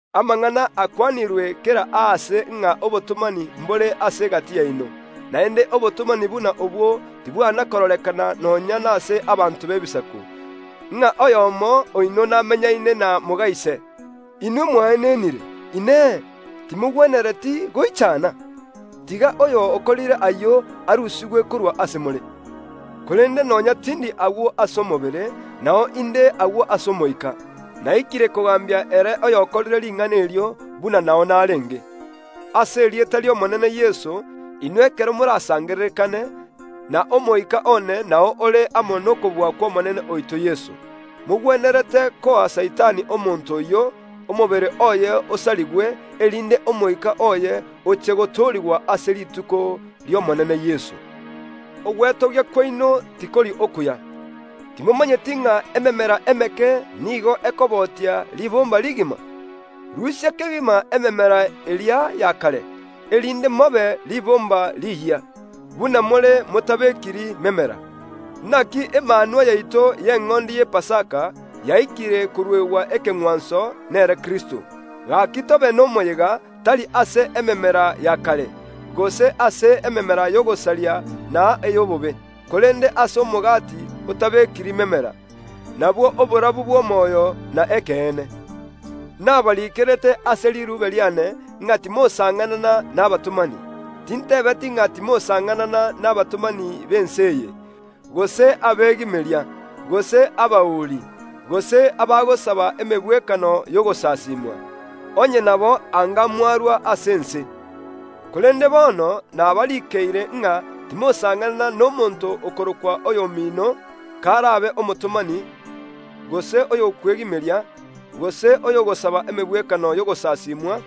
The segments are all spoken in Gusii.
Amang’ana akwanirwe kera aase ng’a obotomani mbore ase egati yaino, naende obotomani buna obwo tibwana kororekana nonya nase abanto b’Ebisaku, ng’a oyomo oino namenyaine na moga ise, Inwe mwaenenire! Inee! Timogwenereti goichana? Tiga oyo okorire ayio arusigwe korwa ase more. Korende nonya tindi agwo ase omobere, nao inde agwo ase omoika. Naikire kogambia ere oyokorire ring’ana erio, buna nao narenge. Ase erieta ri’Omonene Yeso, inwe ekero morasangererekane, na omoika one nao ore amo nokobua kw’Omonene oito Yeso, mogwenerete koa Saitani omonto oyio, omobere oye osarigwe, erinde omoika oye oche gotoorigwa ase rituko ri’Omonene Yeso. Ogwetogia kwaino tikori okuya. Timomanyeti ng’a ememera emeke nigo ekobotia ribomba rigima? Rusia kegima ememera eria ya kare, erinde mobe ribomba riyia, buna more motabekiri memera. Naki Emanwa yaito y’Eng’ondi y’Epasaka yaikire koruegwa ekeng’wanso, nere Kristo. Gaki tobe nomoyega, tari ase ememera ya kare, gose ase ememera y’ogosaria na ey’obobe, korende ase omogati otabekiri memera, nabwo oborabu bw’omoyo na ekeene. Nabariikerete ase riruube riane, ng’a timosang’anana nabatomani. Tintebeti ng’a timosang’anana nabatomani b’ense eye, gose abegimeria, gose abauri, gose abagosaba emegwekano y’ogosasimwa; onye nabo anga mwarua ase ense. Korende bono nabarikeire ng’a timosang’anana nomonto okorokwa oyomino, karabe omotomani, gose oyokwegimeria, gose oyogosaba emegwekano y’ogosasimwa,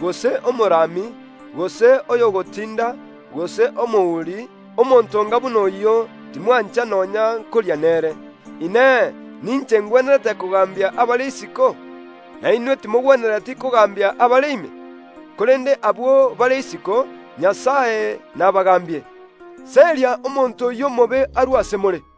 gose omorami, gose oyogotinda, gose omouri, omonto onga buna oyio, timwancha nonya nkoria nere. Inee! Ninche ngwenerete kogambia abare isiko? Na inwe timogwenereti kogambia abare ekanisa ime? Korende abwo bare isiko, Nyasae nabagaambie, “Seria omonto oyio omobe arue ase more.”